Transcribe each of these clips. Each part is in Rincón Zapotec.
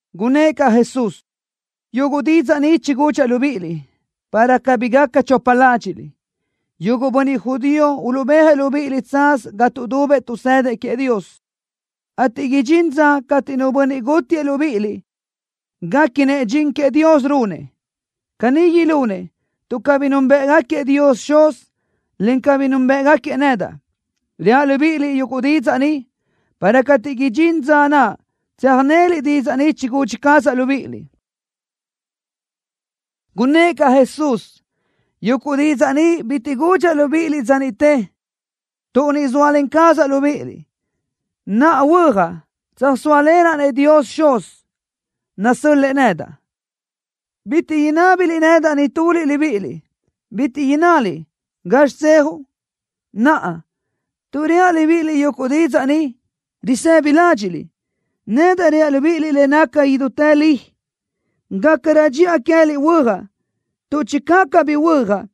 Gunnë́ʼ caʼ Jesús: —Yuguʼ didzaʼ ni chigudxaʼ libíʼiliʼ, para cabí gaca chopa ládxiʼliʼ. Yuguʼ bönniʼ judío uluʼbéajëʼ libíʼiliʼ tsaz ga tuʼdubëʼ tuʼsëdëʼ queëʼ Dios, ateʼ idxín dza cateʼ nu bönniʼ gútiëʼ libíʼiliʼ guéquinëʼ dxin queëʼ Dios runëʼ. Caní ilunëʼ, tuʼ cabí núnbëʼgaquiëʼ Dios Xuz, en cabí núnbëʼgaquiëʼ nedaʼ. Reaʼ libíʼiliʼ yuguʼ didzaʼ ni, para cateʼ idxín dza naʼ, tsöjnéliʼ didzaʼ ni chigudxi cazaʼ libíʼiliʼ. Gunnë́ʼ caʼ Jesús: —Yuguʼ didzaʼ ni bitiʼ gudxaʼ libíʼiliʼ dza niʼte, tuʼ niʼ zóalen cazaʼ libíʼiliʼ. Naʼa huöjaʼ, tsöjsóalenaʼ-nëʼ Dios Xuz, nasö́l-lëʼë nedaʼ. Bitiʼ inábiliʼ nedaʼ nituliʼ libíʼiliʼ, bitiʼ innaliʼ: ¿Gazxi tsejuʼ? Naʼa, tuʼ reaʼ libíʼiliʼ yuguʼ didzaʼ ni, risëbi ládxiʼliʼ. Nedaʼ reaʼ libíʼiliʼ le naca idútë li. Gácarö dxiʼa queë́liʼ huöjaʼ, tuʼ channö cabí huöjaʼ,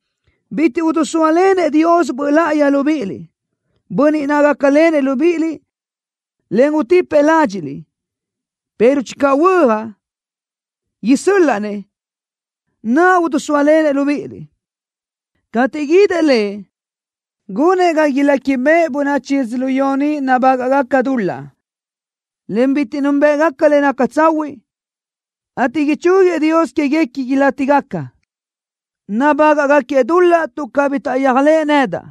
bitiʼ idisóalenëʼ Dios Böʼ Láʼayi libíʼiliʼ, Bönniʼ naʼ gácalenëʼ libíʼiliʼ, en utipëʼ ládxiʼliʼ, pero channö huöjaʼ, isö́l-laʼa-nëʼ, naʼ idisóalenëʼ libíʼiliʼ. Cateʼ guídëʼ Lëʼ, gunëʼ ga iléquibeʼe bönachi yödzölió ni nabágaʼgaca dul-laʼ, en bitiʼ núnbëʼgaca le naca tsahuiʼ, ateʼ ichúguiëʼ Dios quéguequi ilátigaca. Nabágaʼgaquiëʼ dul-laʼ tuʼ cabí taʼyéajlëʼë nedaʼ.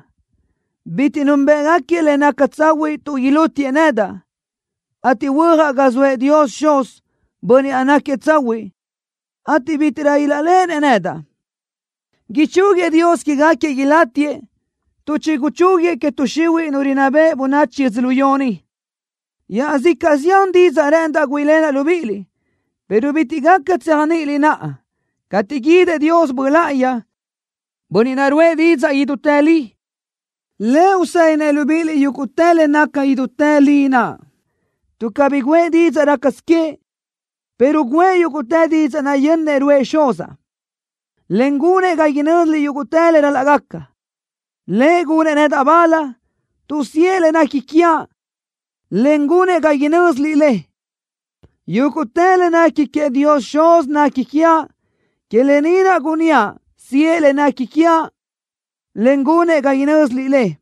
Bitiʼ núnbëʼgaquiëʼ le naca tsahuiʼ tuʼ ilútiëʼ nedaʼ, ateʼ huöjaʼ ga zoëʼ Dios Xuz, Bönniʼ naʼ náquiëʼ tsahuiʼ, ateʼ bítiʼrö ilaʼléʼenëʼ nedaʼ. Ichúguiëʼ Dios quégaquiëʼ ilátiëʼ tuʼ chiguchúguiëʼ que tuʼ xihuiʼ nu rinná beʼe bönachi yödzölió ni. ’Iaʼzicaʼ zián didzaʼ rë́ʼëndaʼ güíʼilenaʼ libíʼiliʼ, pero bitiʼ gaca tséajniʼiliʼ naʼa. Cateʼ guídëʼ Dios Böʼ Láʼayi, Bönniʼ naʼ ruʼë didzaʼ idútë li, Lëʼ usedinëʼ libíʼiliʼ yúguʼtë le naca idútë li naʼ, tuʼ cabí guʼë didzaʼ rácasö queëʼ, pero guʼë yúguʼtë didzaʼ naʼ yönnëʼ ruʼë Xuzaʼ, en gunëʼ ga inö́ziliʼ yúguʼtë le ral-laʼ gaca. Lëʼ gunëʼ nedaʼ bal, tuʼ siʼë le nequi quiaʼ, en gunëʼ ga inö́ziliʼ le. Yúguʼtë le nequi queëʼ Dios Xuz nequi quiaʼ. Que lë ni naʼ gunníaʼ siʼë le nequi quiaʼ, en gunëʼ ga inö́ziliʼ le.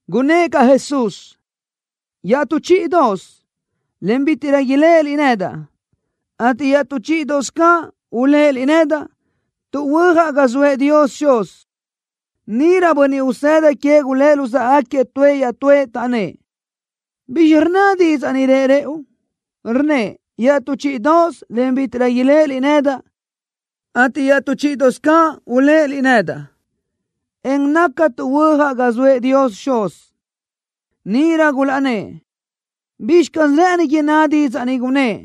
Gunnë́ʼ caʼ Jesús: —Yetú chíʼidoʼosö, en bítiʼrö iléʼeliʼ nedaʼ, ateʼ iaʼtú chíʼidoʼosö caʼ uléʼeliʼ nedaʼ, tuʼ huöjaʼ ga zoëʼ Dios Xuz. Níʼirö bönniʼ usëda queëʼ gulë́ luzáʼagaquiëʼ tuëʼ iaʼtúëʼ, taʼnnë́ʼ: —¿Bizxi rnna didzaʼ ni rëʼ rëʼu? Rnnëʼ: “Iaʼtú chíʼidoʼosö, en bítiʼrö iléʼeliʼ nedaʼ, ateʼ iaʼtú chíʼidoʼosö caʼ uléʼeliʼ nedaʼ, en naca tuʼ huöjaʼ ga zoëʼ Dios Xuz.” Níʼirö gulaʼnnë́ʼ: —¿Bizxi caz rë́ʼëni inná didzaʼ ni, gunnë́ʼ: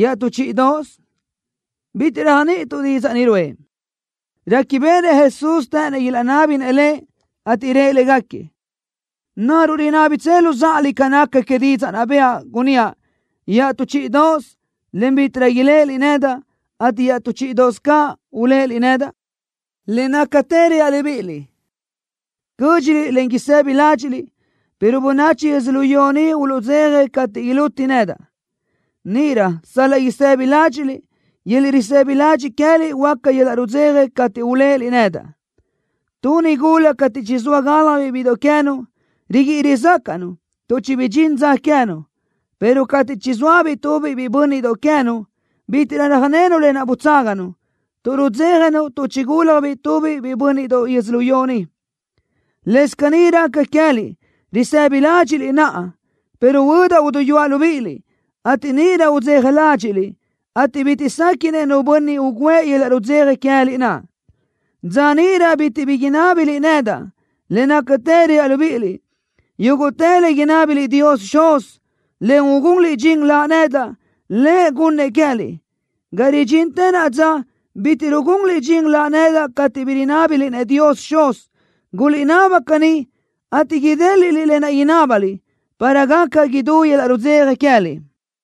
“Iaʼtú chíʼidoʼosö”? Bitiʼ réajniʼituʼ didzaʼ ni ruʼë. Réquibeʼenëʼ Jesús të́ʼënnëʼ ilaʼnábinëʼ Lëʼ, ateʼ rëʼ légaquiëʼ: —¿Naruʼ rinábitsö luzáʼaliʼ ca naca que didzaʼ naʼ bëʼa, gunníaʼ: Iaʼtú chíʼidoʼosö, en bítiʼrö iléʼeliʼ nedaʼ, ateʼ iaʼtú chíʼidoʼosö caʼ uléʼeliʼ nedaʼ? Le nácatë reaʼ libíʼiliʼ: Cö́dxiliʼ, en isëbi ládxiʼliʼ, pero bönachi yödzölió ni uluʼdzeja cateʼ iluti nedaʼ. Níʼirö sal-laʼ isëbi ládxiʼliʼ, yöl-laʼ risëbi ladxiʼ queë́liʼ huöáca yöl-laʼ rudzeja cateʼ uléʼeliʼ nedaʼ. Tu nigula cateʼ chizóa gáljabiʼ bíʼidoʼ queë́nu, riguíʼi rizácaʼnu, tuʼ chibidxín dza queë́nu, pero cateʼ chizóabiʼ tubiʼ biʼi bö́nniʼdoʼ queë́nu, bítiʼrö röjnenu lë naʼ butságanu, tuʼ rudzéjanu tuʼ chigúlajbiʼ tubiʼ biʼi bö́nniʼdoʼ yödzölió ni. Lëscaʼ caní raca queë́liʼ, risëbi ládxiʼliʼ naʼa, pero huödaʼ uduyúaʼ libíʼiliʼ, ateʼ níʼirö udzeja ládxiʼliʼ, ateʼ bitiʼ séquiʼnëʼ nu bönniʼ ugǘëʼ yöl-laʼ rudzeja queë́liʼ naʼ. ’Dza níʼirö bitiʼ bi inábiliʼ nedaʼ. Le nácatë reaʼ libíʼiliʼ: Yúguʼtë le inábiliʼ Dios Xuz, en ugunliʼ dxin Laʼ nedaʼ, Lëʼ gunnëʼ queë́liʼ. Ga ridxintë naʼa dza bitiʼ rugunliʼ dxin Laʼ nedaʼ cateʼ bi rinábiliʼ-nëʼ Dios Xuz. Guliʼnaba caní, ateʼ idéliʼliʼ lë naʼ inábaliʼ, para gaca idú yöl-laʼ rudzeja queë́liʼ.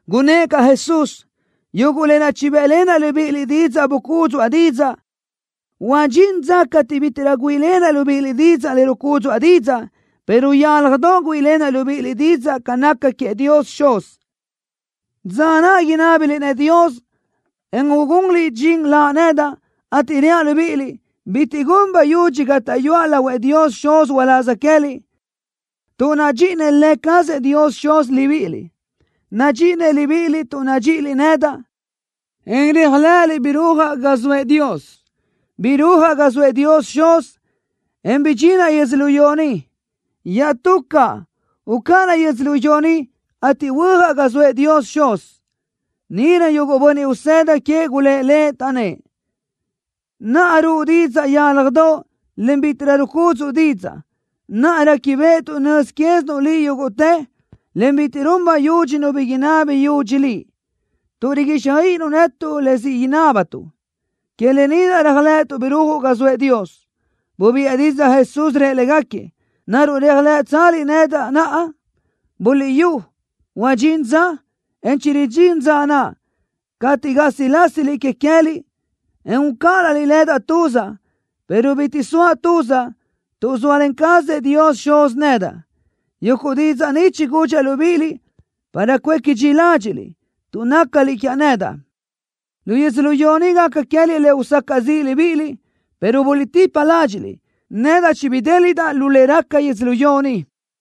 Gunnë́ʼ caʼ Jesús: —Yuguʼ lë naʼ chibë́ʼlenaʼ libíʼiliʼ didzaʼ bucúdzuʼa didzaʼ. Huadxín dza cateʼ bítiʼrö güíʼilenaʼ libíʼiliʼ didzaʼ le rucúdzuʼa didzaʼ, pero yálajdoʼ güíʼilenaʼ libíʼiliʼ didzaʼ ca naca queëʼ Dios Xuz. Dza naʼ inábiliʼ-nëʼ Dios, en ugunliʼ dxin Laʼ nedaʼ, ateʼ reaʼ libíʼiliʼ, bitiʼ gun bayudxi gátaʼyuaʼ lahuëʼ Dios Xuz uláz queë́liʼ, tuʼ nadxíʼinëʼ Lë cazëʼ Dios Xuz libíʼiliʼ. Nadxíʼinëʼ libíʼiliʼ tuʼ nadxíʼiliʼ nedaʼ, en réajlëʼëliʼ birúajaʼ ga zoëʼ Dios. Birúajaʼ ga zoëʼ Dios Xuz, en bidxinaʼ yödzölió ni. Iaʼtú caʼ, ucáʼanaʼ yödzölió ni, ateʼ huöjaʼ ga zoëʼ Dios Xuz. Níʼirö yuguʼ bönniʼ usëda queëʼ gulë́ʼ Lëʼ, taʼnnë́ʼ: —Naʼa ruʼu didzaʼ yálajdoʼ, en bítiʼrö rucúdzuʼu didzaʼ. Naʼa réquibeʼetuʼ nöz quézinuʼ Liʼ yúguʼtë, en bitiʼ run bayudxi nu bi inabi yudxi Liʼ, tuʼ riguíxjöiʼinuʼ netuʼ le siʼ inábatuʼ. Que lë ni naʼ réajlëʼëtuʼ birúajuʼ ga zoëʼ Dios. Bubiʼë didzaʼ Jesús, rëʼ légaquiëʼ: —¿Naruʼ réajlëʼtsaliʼ nedaʼ naʼa? Buliʼyú, huadxín dza, en chiridxín dza naʼ, cateʼ gásilasiliʼ que queë́liʼ, en ucáʼanaliʼ nedaʼ tuzaʼ, pero bitiʼ soaʼ tuzaʼ, tuʼ zóalen cazëʼ Dios Xuz nedaʼ. Yuguʼ didzaʼ ni chigudxaʼ libíʼiliʼ para cuéqui dxi ládxiʼliʼ, tuʼ nácaliʼ quiaʼ nedaʼ. Lu yödzölió ni gaca queë́liʼ le usacaʼ ziʼ libíʼiliʼ, pero buliʼtipa ládxiʼliʼ. Nedaʼ chibidéliʼdaʼ lu le raca yödzölió ni.